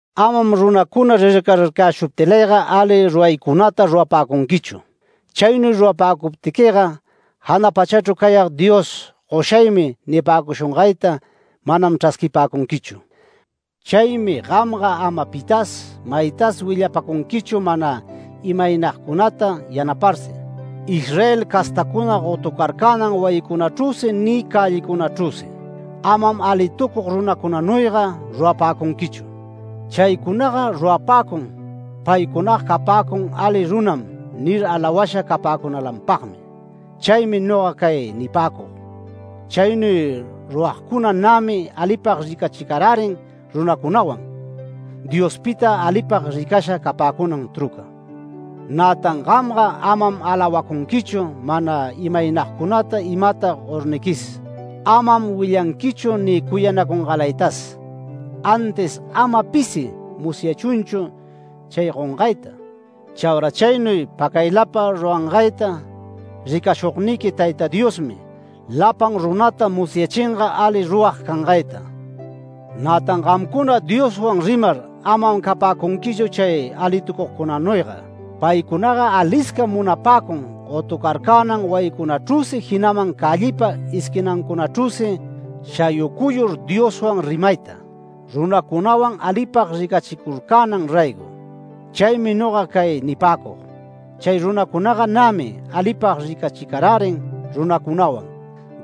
“Amam runacuna rircararcayäshuptilayga ali ruraycunata rurapäcunquichu. Chaynuy rurapäcuptiquiga jana pachachru cayag Dios ‘Goshaymi’ nipäcushungayta manam chrasquipäcunquichu. Chaymi gamga ama pitas maytas willapacunquichu mana imaynagcunata yanaparsi, Israel castacuna gotucarcänan wayicunachrüsi ni cällicunachrüsi. Amam alitucug runacunanuyga rurapäcunquichu. Chaycunaga rurapäcun ‘Paycunaga capäcun ali runam’ nir alawasha capäcunalanpagmi. Chaymi noga cay nipäcug: Chaynuy ruragcuna nämi alipag ricachicarärin runacunawan, Diospita alipag ricasha capäcunan truca. Nätan gamga amam alawapäcunquichu mana imaynagcunata imata gorniquis. Amam willanquichu ni cuyanacungalaytas. Antis ama pisi musyachunchu chay gongayta. Chaura chaynuy pacaylapa rurangayta ricashugniqui Tayta Diosmi, lapan runata musyachinga ali rurag cangayta”. “Nätan gamcuna Dioswan rimar amam capäcunquichu chay alitucugcunanuyga. Paycunaga aliscam munapäcun gotucarcänan wayicunachrüsi jinaman cällipa esquinancunachrüsi shayucuyur Dioswan rimayta, runacunawan alipag ricachicurcänan raygo. Chaymi noga cay nipäcug: Chay runacunaga nämi alipag ricachicarärin runacunawan,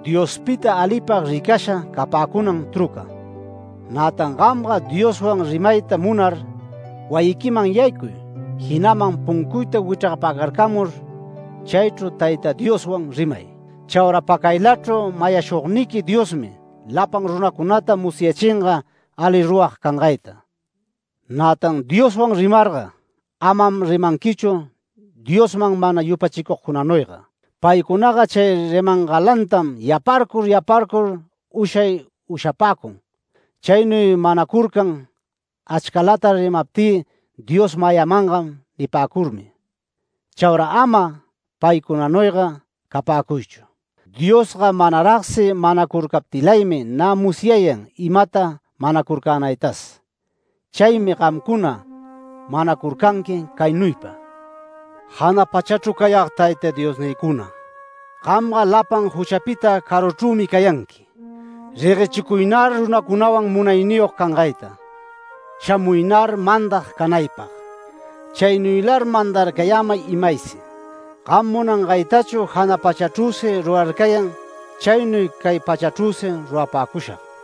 Diospita alipag ricasha capäcunan truca. Nätan gamga Dioswan rimayta munar wayiquiman yaycuy, jinaman puncuyta wichrgapacarcamur, chaychru Tayta Dioswan rimay. Chaura pacaylachru mayashugniqui Diosmi lapan runacunata musyachinga ali rurag cangayta. Nätan Dioswan rimarga, amam rimanquichu Diosman mana yupachicugcunanuyga. Paycunaga chay rimangalantam yaparcur yaparcur ushay ushapäcun. Chaynuy manacurcan ‘Achcalata rimaptï Dios mayamangam’ nipäcurmi. Chaura ama paycunanuyga capäcuychu. Diosga manaragsi manacurcaptilaymi nä musyayan imata manacurcänaytas. Chaymi gamcuna manacurcanqui caynuypa: ‘Jana pachachru cayag Tayta Diosnïcuna, gamga lapan juchapita caruchrümi cayanqui. Reguechicuynar runacunawan munayniyog cangayta. Shamuynar mandag canaypag. Chaynuylar mandarcayämay imaysi. Gam munangaytachu jana pachachrüsi rurarcayan chaynuy cay pachachrüsi rurapäcushag.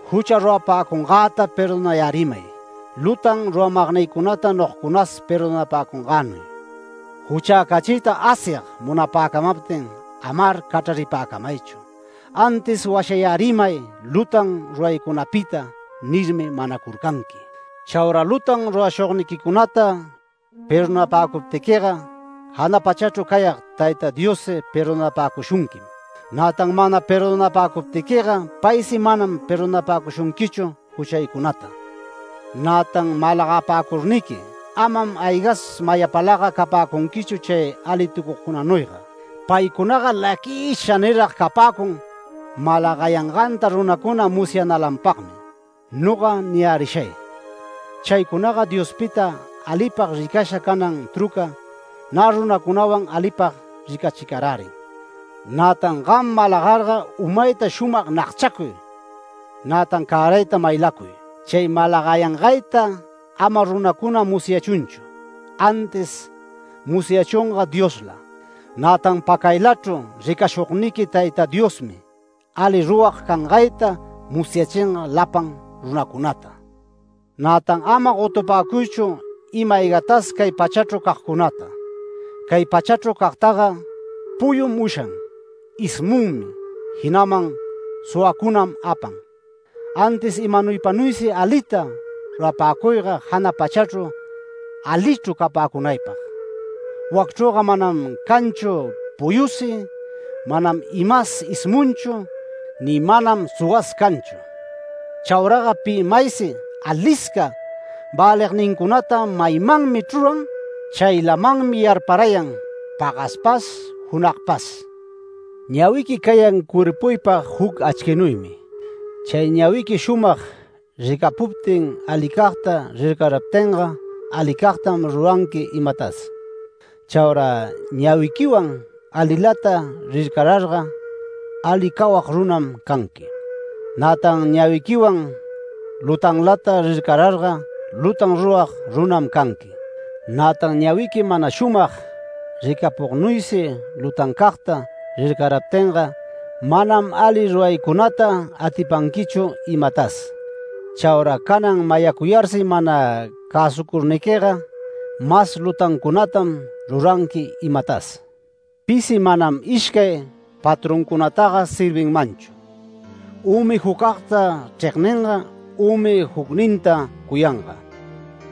Jucha rurapäcungäta perdonayärimay, lutan ruramagnïcunata nogacunas perdonapäcungänuy. Juchäcachiyta Asyag munapäcamaptin amar cachraripäcamaychu. Antis washayärimay lutan ruraycunapita’ nirmi manacurcanqui. Chaura lutan rurashugniquicunata perdonapäcuptiquiga jana pachachru cayag Tayta Diossi perdonapäcushunquim. Nätan mana perdonapäcuptiquiga paysi manam perdonapäcushunquichu juchaycunata”. “Nätan malagapäcurniqui amam aygas mayapalaga capäcunquichu chay alitucugcunanuyga. Paycunaga laquisha nirag capäcun malagayanganta runacuna musyanalanpagmi. Noga niyärishay: Chaycunaga Diospita alipag ricasha canan trucam nä runacunawan alipag ricachicarärin. Nätan gam malagarga umayta shumag nagchacuy nätan cärayta maylacuy. Chay malagayangayta ama runacuna musyachunchu, antis musyachunga Diosla. Nätan pacaylachru ricashugniqui Tayta Diosmi ali rurag cangayta musyachinga lapan runacunata”. “Nätan ama gotupäcuychu ima-aygatas cay pachachru cagcunata. Cay pachachru cagtaga puyum ushan, ismunmi, jinaman suwacunam apan. Antis imanaypanuysi alita rurapäcuyga jana pachachru alichru capäcunaypag. Wacchrüga manam canchu puyusi, manam imas ismunchu, ni manam suwas canchu. Chauraga pi maysi alisca välignincunata maymanmi chruran. Chaylamanmi yarparayan pagaspas junagpas. Ñawiqui cayan cuerpuypag juc achquinuymi. Chay ñawiqui shumag ricapuptin alicagta rircaraptinga alicagtam ruranqui imatas. Chaura ñawiquiwan alilata rircararga, ali cawag runam canqui. Nätan ñawiquiwan lutanlata rircararga, lutan rurag runam canqui. Nätan ñawiqui mana shumag ricapugnuysi lutancagta rircäriptinga manam ali ruraycunata atipanquichu imatas. Chaura canan mayacuyarsi mana cäsucurniquiga, mas lutancunatam ruranqui imatas. Pisi manam ishcay patroncunataga servinmanchu; ümi jucagta chregninga, ümi jucninta cuyanga;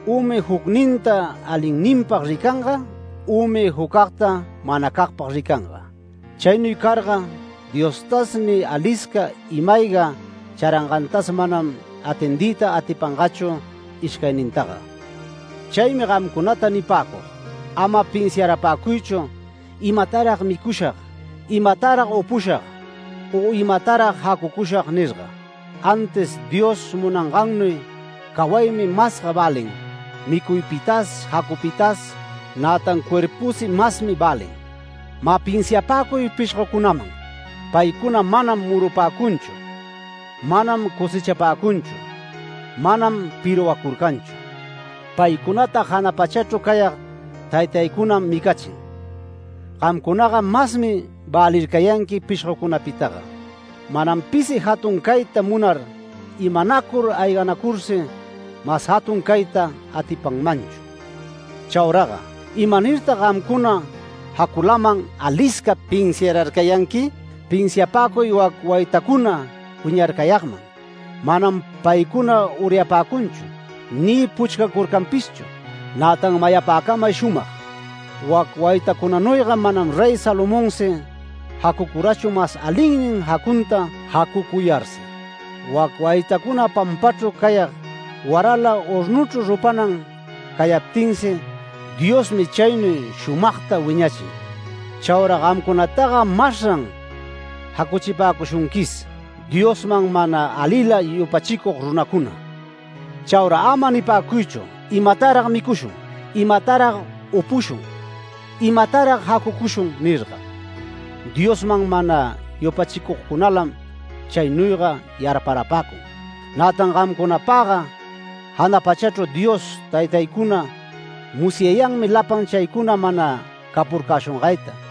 ümi jucninta alinninpag ricanga, ümi jucagta manacagpag ricanga. Chaynuy carga Diostas ni alisca ima-ayga charangantas manam atendiyta atipangachu ishcaynintaga. Chaymi gamcunata nipäcug: Ama pinsiarapäcuychu ‘Imatarag micushag, imatarag upushag u imatarag jacucushag’ nirga. Antis Dios munangannuy cawaymi masga välin micuypitas jacupitas, nätan cuerpusi masmi välin. Mä pinsiapäcuy pishgocunaman. Paycuna manam murupäcunchu, manam cosechapäcunchu, manam pirwacurcanchu. Paycunata jana pachachru cayag Taytaycunam micachin. Gamcunaga masmi välircayanqui pishgocunapitaga. Manam pisi jatun cayta munar imanacur ayganacursi mas jatun cayta atipanmanchu. Chauraga ¿imanirtag gamcuna jaculaman alisca pinsiararcayanqui? Pinsiapäcuy wac waytacuna wiñarcayagman. Manam paycuna uryapäcunchu, ni puchcacurcanpishchu. Nätan mayapäcamay shumag: Wac waytacunanuyga manam Rey Salomonsi jacucurachu mas alinnin jacunta jacucuyarsi. Wac waytacuna pampachru cayag, warala hornuchru rupanan cayaptinsi, Diosmi chaynuy shumagta wiñachin. Chaura gamcunataga masran jacuchipäcushunquis, Diosman mana alila yupachicug runacuna. Chaura ama nipäcuychu ‘¿Imatarag micushun? ¿Imatarag upushun? ¿Imatarag jacucushun?’ nirga. Diosman mana yupachigcunalam chaynuyga yarparapäcun. Nätan gamcunapaga jana pachachru Dios Taytaycuna musyayanmi lapan chaycuna mana capurcäshungayta.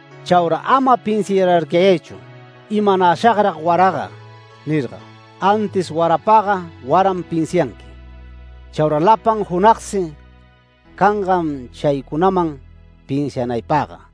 Chaura ama pinsiararcayaychu ‘¿Imanäshagrag waraga?’ nirga. Antis warapagga waram pinsianqui. Chaura lapan junagsi cangam chaycunaman pinsianaypagga”.